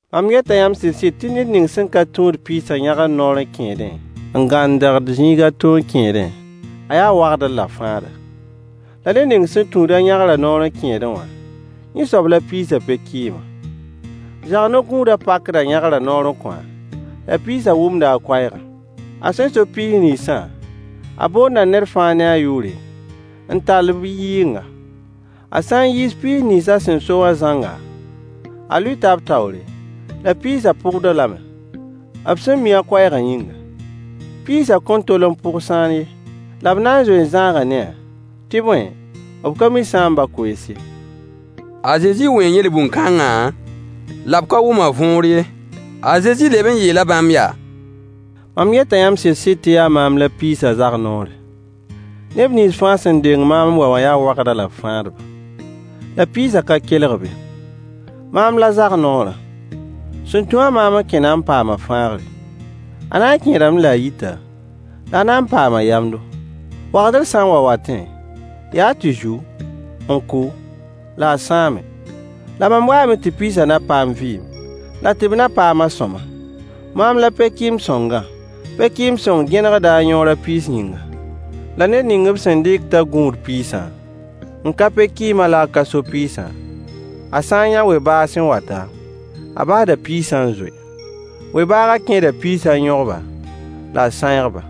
Mam yeta yãmb sɩd-sɩd tɩ ned ning sẽn ka tũud piisã yãgr noor n kẽedẽ, n gãndgd zĩig a to n kẽedẽ, a yaa wagdr la fãada. La ned ning sẽn tũud-a yãgrã noor n kẽedẽ wã, yẽ soab la piisã pe-kɩɩma. Zag-no-gũudã pakda yãgrã noor n kõ-a, la piisã wʋmda a koɛɛgã. A sẽn so piis ninsã, a boonda ned fãa ne a yʋʋre, n tall-b n yi yɩnga. A sã n yiis piis nins a sẽn so wã zãnga, a lʋɩta b taoore, la piisã pʋgd-a lame, b sẽn mi a koɛɛgã yĩnga. Piisã kõn tol n pʋg sãan ye, la b na n zoe n zãaga ne-a, tɩ bõe, b ka mi sãambã koees ye. A Zezi wẽe yel-bũn kãngã, la b ka wʋm a võor ye. A Zezi leb n yeela bãmb yaa: Mam yeta yãmb sɩd-sɩd tɩ yaa maam la piisã zag-noore. Neb nins fãa sẽn deng maam n wa wã yaa wagda la fãadba. La piisã ka kelg-b ye. Maam la zag-noorã. Sẽn tũ-a maam n kẽ na n paama fãagre. A na n kẽedame la yita, la a na n paama yamdo. Wagdr sã n wa n watẽ, yaa tɩ zu, n kʋ, la a sãame. La mam waame tɩ piisã na paam vɩɩm, la tɩ b na paam-a sõama. Maam la pe-kɩɩm-sõngã. Pe-kɩɩm-sõng gẽnegda a yõor a piis yĩnga. La ned ning b sẽn dɩk t'a gũud piisã, n ka pe-kɩɩmã la a ka so piisã, a sã n yã we-baag sẽn wata, a basda piisã n zoe. We-baagã kẽeda piisã n yõg-ba, la a sãeeg-ba.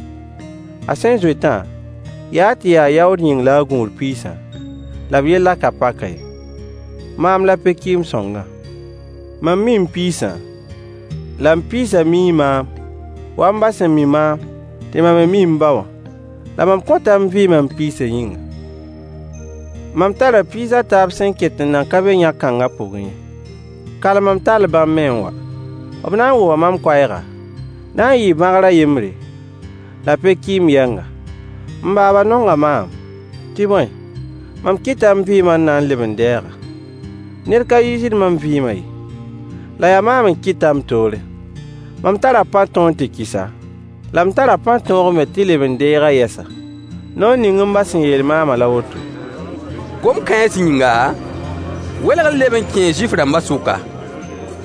A sẽn zoetã, yaa tɩ yaa yaood yĩng la a gũud piisã, la b yellã ka pak-a ye. Maam la pe-kɩɩm-sõngã. Mam mii m piisã, la m piisã mii maam, wa m ba wã sẽn mi maam tɩ mam me mi m ba wã, la mam kõta m vɩɩmã m piisã yĩnga. Mam tara piis a taab sẽn ket n nan ka be yãg-kãngã pʋgẽ ye. Kal mam tall bãmb me n wa. B na n wʋma mam koɛɛga, na n yɩɩ bãgr a yembre, la pe-kɩɩm yɛnga. M baaba nonga maam, tɩ bõe, mam kɩta m vɩɩma n na n leb n deeg-a. Ned ka yiisd mam vɩɩmã ye, la yaa maam n kɩt-a m toore. Mam tara pãn-tõog tɩ kɩs-a, la m tara pãn-tõog me tɩ leb n deeg-a yɛsa. Noor ning m ba sẽn yeel maamã la woto. Gom-kãens yĩnga, welgr leb n kẽe Zuif-rãmbã sʋka.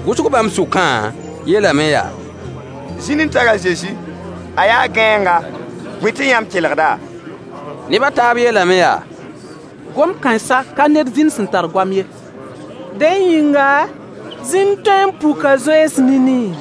Wʋsg bãmb sʋkã yeelame yaa: Zĩn n tar a Zezi! A yaa gãeenga! Bõe tɩ yãmb kelgd-a? Neb a taab yeelame yaa: Gom-kãensã ka ned zĩn sẽn tar goam ye. Dẽ yĩnga, zĩn tõe n puka zoens nini?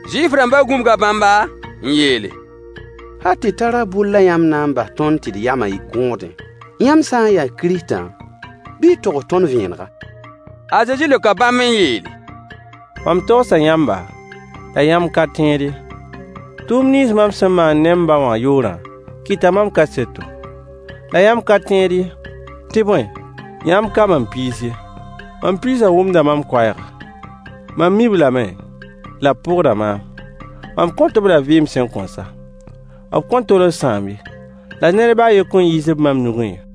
Zuif-rãmbã gũbga bãmba n yeele: Hal tɩ ta dabʋr la yãmb na n bas tõnd tɩ d yamã gõodẽ? Yãmb sã n yaa Kiristã, bɩ y togs tõnd vẽenega. A Zezi leoka bãmb n yeele: Mam togsa yãmba, la yãmb ka tẽed ye. Tʋʋm nins mam sẽn maand ne m ba wã yʋʋrã kɩta mam kaseto. La yãmb ka tẽed ye, tɩ bõe, yãmb ka mam piis ye. Mam piisã wʋmda mam koɛɛga. Mam mi-b lame, la b pʋgda maam. Mam kõt-b-la vɩɩm sẽn kõn sa. B kõn tol n sãam ye, la ned baa a yen kõn yiis-b mam nugẽ ye.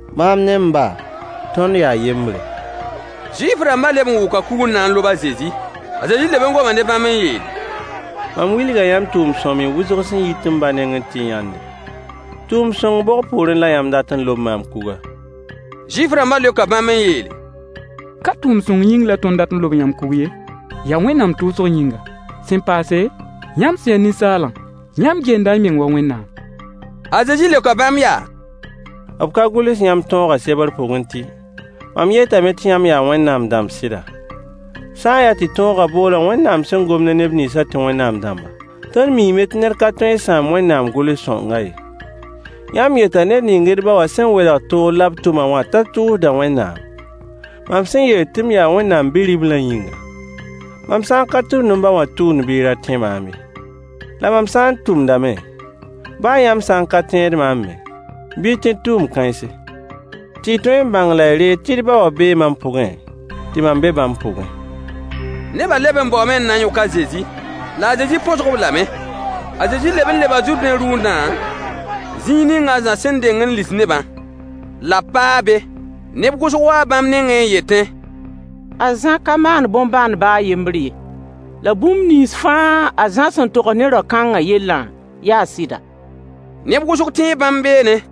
Maam ne m ba, tõnd yaa yembre. Zuif-rãmbã leb n wʋka kug n na n lob a Zezi. A Zezi leb n goma ne bãmb n yeele: Mam wilga yãmb tʋʋm sõamy wʋsg sẽn yit m ba nengẽ tɩ y yãnde. Tʋʋm-sõng bʋg poorẽ la yãmb dat n lob maam kugã? Zuif-rãmbã leoka bãmb n yeele: Ka tʋʋm-sõng yĩng la tõnd dat n lob yãmb kug ye, yaa Wẽnnaam tʋʋsg yĩnga. Sẽn paase, yãmb sẽn ya ninsaalã, yãmb geenda y meng wa Wẽnnaam. A Zezi leoka bãmb yaa: B ka gʋls yãmb tõogã sebr pʋgẽ tɩ: “Mam yetame tɩ yãmb yaa wẽnnaam dãmb” sɩda? Sã n yaa tɩ tõogã boola Wẽnnaam sẽn gom ne neb ninsã tɩ wẽnnaam dãmba — tõnd d miime tɩ ned ka tõe n sãam Wẽnnaam gʋls-sõngã ye —, yãmb yeta ned ning d ba wã sẽn welg toor la b tʋm-a wã t'a tʋʋsda Wẽnnaam, mam sẽn yeel tɩ m yaa Wẽnnaam bi-riblã yĩnga. Mam sã n ka tʋmd m ba wã tʋʋmd bɩ y ra tẽ maam ye. La mam sã n tʋmdame, baa yãmb sã n ka tẽed maam me, bɩ y tẽ tʋʋm-kãense, tɩ y tõe n bãng la y reeg tɩ d ba wã bee mam pʋgẽ, tɩ mam be bãmb pʋgẽ. Nebã leb n baoome n na n yõk a Zezi, la a Zezi põsg-b lame. A Zezi leb n leba Zʋrdẽ rʋʋndã, zĩig ning a Zã sẽn deng n lis nebã, la b paa be. Neb wʋsg waa bãmb nengẽ n yetẽ: A Zã ka maan bõn-bãnd baa a yembr ye. La bũmb nins fãa a Zã sẽn togs ne rao-kãngã yellã yaa sɩda. Neb wʋsg tẽe bãmb beene.